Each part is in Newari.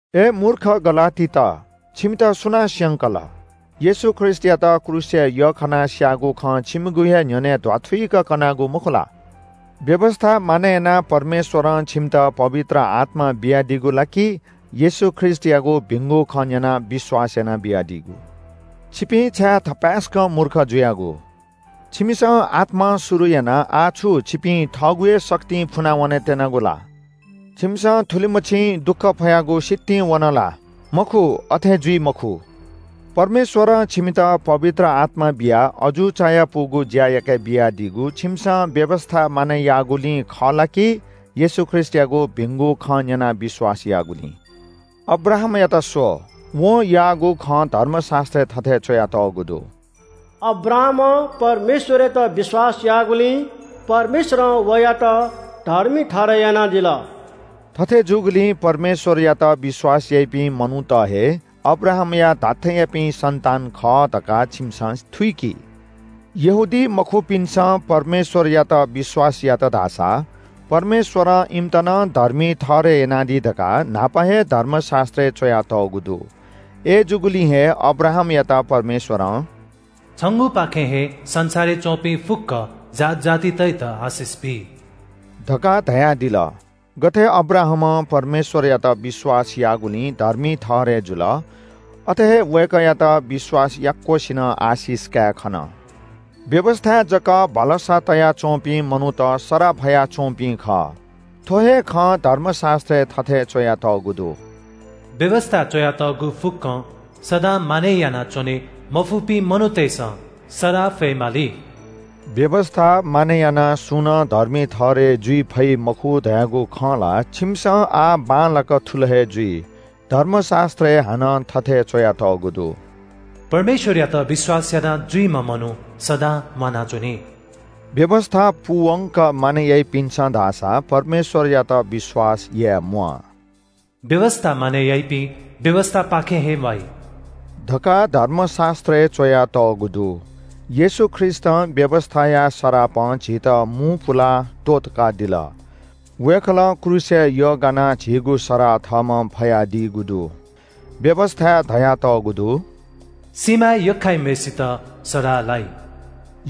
अय् मूर्ख गलातीत, छिमित सुनां स्‍यंकल? येशू ख्रीष्‍टयात क्रूसय् यख्‍खानाः स्‍याःगु खँ छिमिगु हे न्‍ह्यःने ध्‍वाथुइक कनागु मखु ला? व्‍यवस्‍था मानय् यानाः परमेश्‍वरं छिमित पवित्र आत्‍मा बियादीगु ला कि येशू ख्रीष्‍टयागु भिंगु खँ न्‍यनाः विश्‍वास यानाः बियादीगु? छिपिं छाय् थपाय्‌सकं मूर्ख जुयागु? छिमिसं आत्‍मां शुरु यानाः आः छु छिपिं थःगु हे शक्तिं फुना वनेत्‍यनागु ला? छिमिसं थुलिमछि दुःख फयागु सितिं वन ला? मखु, अथे जुइ मखु। परमेश्‍वरं छिमित पवित्र आत्‍मा बियाः अजू चायापुगु ज्‍या याके बियादीगु छिमिसं व्‍यवस्‍था मानय् याःगुलिं खः ला कि येशू ख्रीष्‍टयागु भिंगु खँ न्‍यनाः विश्‍वास याःगुलिं? अब्राहामयात स्‍व! वं याःगु खँ धर्मशास्‍त्रय् थथे च्‍वयातःगु दु – “अब्राहामं परमेश्‍वरयात विश्‍वास याःगुलिं परमेश्‍वरं वयात धर्मी ठहरय् यानादिल।” थथे जूगुलिं परमेश्‍वरयात विश्‍वास याइपिं मनूत हे अब्राहामया धात्‍थेंयापिं सन्‍तान खः धकाः छिमिसं थुइकि। यहूदीमखुपिन्‍सं परमेश्‍वरयात विश्‍वास यात धाःसा परमेश्‍वरं इमित नं धर्मी ठहरय् यानादी धकाः न्‍हापा हे धर्मशास्‍त्रय् च्‍वयातःगु दु। अय्‌जूगुलिं हे अब्राहामयात परमेश्‍वरं “छंगुपाखें हे संसारय् च्‍वंपिं फुक्‍क जात जातितय्‌त आशिष बी” धकाः धयादिल। गथे अब्राहाम परमेश्‍वरयात विश्‍वास याःगुलिं धर्मी ठहरय् जुल, अथे हे वय्‌कःयात विश्‍वास याक्‍वसिनं आशिष काये खन। व्‍यवस्‍थाय् जक भलसा तया च्‍वंपिं मनूत सराः फयाच्‍वंपिं खः। थ्‍व हे खँ धर्मशास्‍त्रय् थथे च्‍वयातःगु दु – “व्‍यवस्‍थाय् च्‍वयातःगु फुक्‍कं सदां मानय् यानाच्‍वने मफुपिं मनूतय्‌सं सराः फयेमाली।” व्‍यवस्‍था मानय् यानाः सुं नं धर्मी ठहरय् जुइ फइ मखु धयागु खँ ला छिमिसं आः बांलाक थुल हे जुइ। धर्मशास्‍त्रय् हानं थथे च्‍वयातःगु दु – “परमेश्‍वरयात विश्‍वास यानाजुइम्‍ह मनू सदां म्‍वानाच्‍वनी।” व्‍यवस्‍था पूवंक मानय् याइपिन्‍सं धाःसा परमेश्‍वरयात विश्‍वास याये म्‍वाः। “व्‍यवस्‍था मानय् याइपिं व्‍यवस्‍थापाखें हे म्‍वाइ” धकाः धर्मशास्‍त्रय् च्‍वयातःगु दु। येशू ख्रीष्‍टं व्‍यवस्‍थाया सरापं झीत मू पुलाः त्‍वःतकादिल। वय्‌कलं क्रूसय् यग्‍गानाः झीगु सराः थःम्‍हं फयादीगु दु। व्‍यवस्‍थाय् धयातःगु दु “सिँयागु थामय् यख्‍खाइम्‍हय्‌सित सराः लाइ।”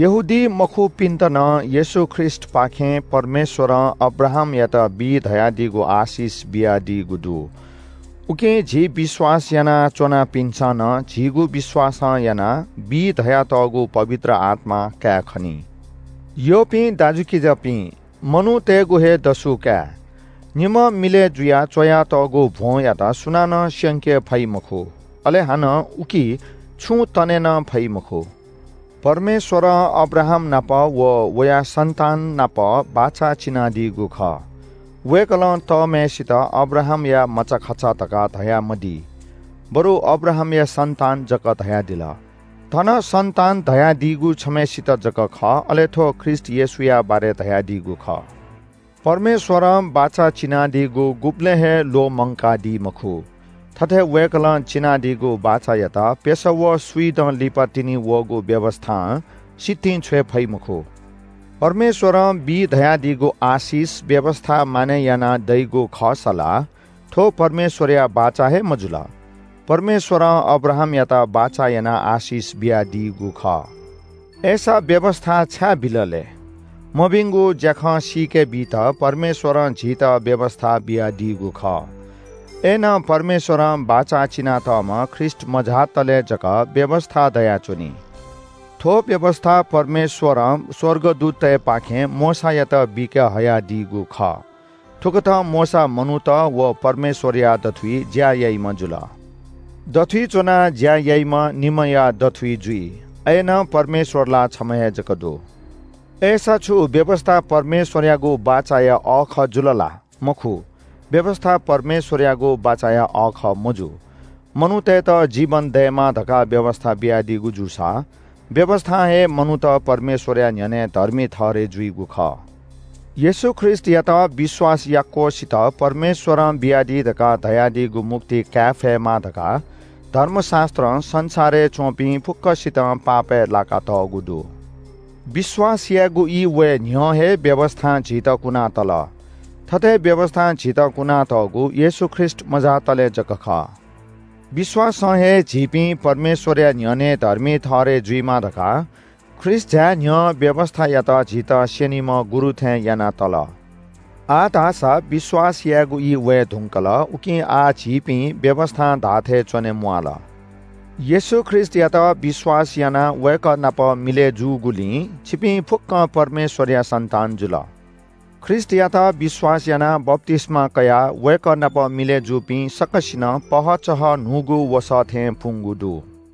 यहूदीमखुपिन्‍त नं येशू ख्रीष्‍टपाखें परमेश्‍वरं अब्राहामयात बी धयादीगु आशिष बियादीगु दु। उकिं झी विश्‍वास याना च्‍वनापिन्‍सं नं झीगु विश्‍वासं यानाः बी धयातःगु पवित्र आत्‍मा कायेखनी। यःपिं दाजुकिजापिं, मनूतय्‌गु हे दसु काये – निम्‍ह मिलय् जुयाः च्‍वयातःगु भ्‍वंयात सुनानं स्‍यंके फइ मखु, अले हानं उकी छुं तने नं फइ मखु। परमेश्‍वरं अब्राहामनाप व वया सन्‍ताननाप बाचा चिनादीगु खः। वय्‌कलं तःम्‍हय्‌सित “अब्राहामया मचाखचा” धकाः धयामदी, बरु “अब्राहामया सन्‍तान” जक धयादिल। थन “सन्‍तान” धयादीगु छम्‍हय्‌सित जक खः, अले थ्‍व ख्रीष्‍ट येशूया बारे धयादीगु खः। परमेश्‍वरं बाचा चिनादीगु गुबलें हे ल्‍वःमंकादी मखु। थथे वय्‌कलं चिनादीगु बाचायात प्‍यसः व स्‍विदँ लिपातिनि वःगु व्‍यवस्‍थां सितिं छ्वये फइ मखु। परमेश्‍वरं बी धयादीगु आशिष व्‍यवस्‍था मानय् यानाः दइगु खःसा ला थ्‍व परमेश्‍वरया बाचा हे मजुल। परमेश्‍वरं अब्राहामयात बाचा यानाः आशिष बियादीगु खः। अय्‌सा व्‍यवस्‍था छाय् बिल लय्? मभिंगु ज्‍याखँ सीके बीत परमेश्‍वरं झीत व्‍यवस्‍था बियादीगु खः। अय्‌नं परमेश्‍वरं बाचा चिनातःम्‍ह ख्रीष्‍ट मझातले जक व्‍यवस्‍था दयाच्‍वनी। थ्‍व व्‍यवस्‍था परमेश्‍वरं स्‍वर्गदूततय्‌पाखें मोशायात बीके हयादीगु खः। थुकथं मोशा मनूत व परमेश्‍वरया दथुइ ज्‍या याइम्‍ह जुल। दथुइ च्‍वना ज्‍या याइम्‍ह निम्‍हया दथुइ जुइ। अय्‌नं परमेश्‍वर ला छम्‍ह हे जक दु। अय्‌सा छु व्‍यवस्‍था परमेश्‍वरयागु बाचाया अःखः जुल ला? मखु, व्‍यवस्‍था परमेश्‍वरयागु बाचाया अःखः मजू। मनूतय्‌त जीवन दयेमा धकाः व्‍यवस्‍था बियादीगु जूसा व्‍यवस्‍थां हे मनूत परमेश्‍वरया न्‍ह्यःने धर्मी ठहरय् जुइगु खः। येशू ख्रीष्‍टयात विश्‍वास याक्‍वसित परमेश्‍वरं बियादी धकाः धयादीगु मुक्ति काये फयेमा धकाः धर्मशास्‍त्रं संसारय् च्‍वंपिं फुक्‍कसितं पापय् लाकातःगु दु। विश्‍वास यायेगु ई वये न्‍ह्यः हे व्‍यवस्‍थां झीत कुनातल। थथे व्‍यवस्‍थां झीत कुनातःगु येशू ख्रीष्‍ट मझातले जक खः। विश्‍वासं हे झीपिं परमेश्‍वरया न्‍ह्यःने धर्मी ठहरय् जुइमा धकाः ख्रीष्‍ट झाये न्‍ह्यः व्‍यवस्‍थायात झीत स्‍यनीम्‍ह गुरु थें याना तल। आः धाःसा विश्‍वास यायेगु ई वये धुंकल, उकिं आः झीपिं व्‍यवस्‍थां धाःथें च्‍वने म्‍वाल। येशू ख्रीष्‍टयात विश्‍वास यानाः वय्‌कः नाप मिलय् जूगुलिं छिपिं फुक्‍कं परमेश्‍वरया सन्‍तान जुल। ख्रीष्‍टयात विश्‍वास यानाः बप्‍तिस्‍मा कयाः वय्‌कः नाप मिलय् जूपिं सकसिनं पहःचहः न्‍हूगु वसः थें पुंगु दु।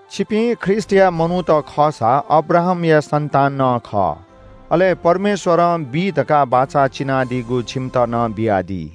छिपिं ख्रीष्‍टया मनूत खःसा अब्राहामया सन्‍तान नं खः। अले परमेश्‍वरं बी धकाः बाचा चिनादीगु छिमित नं बियादी।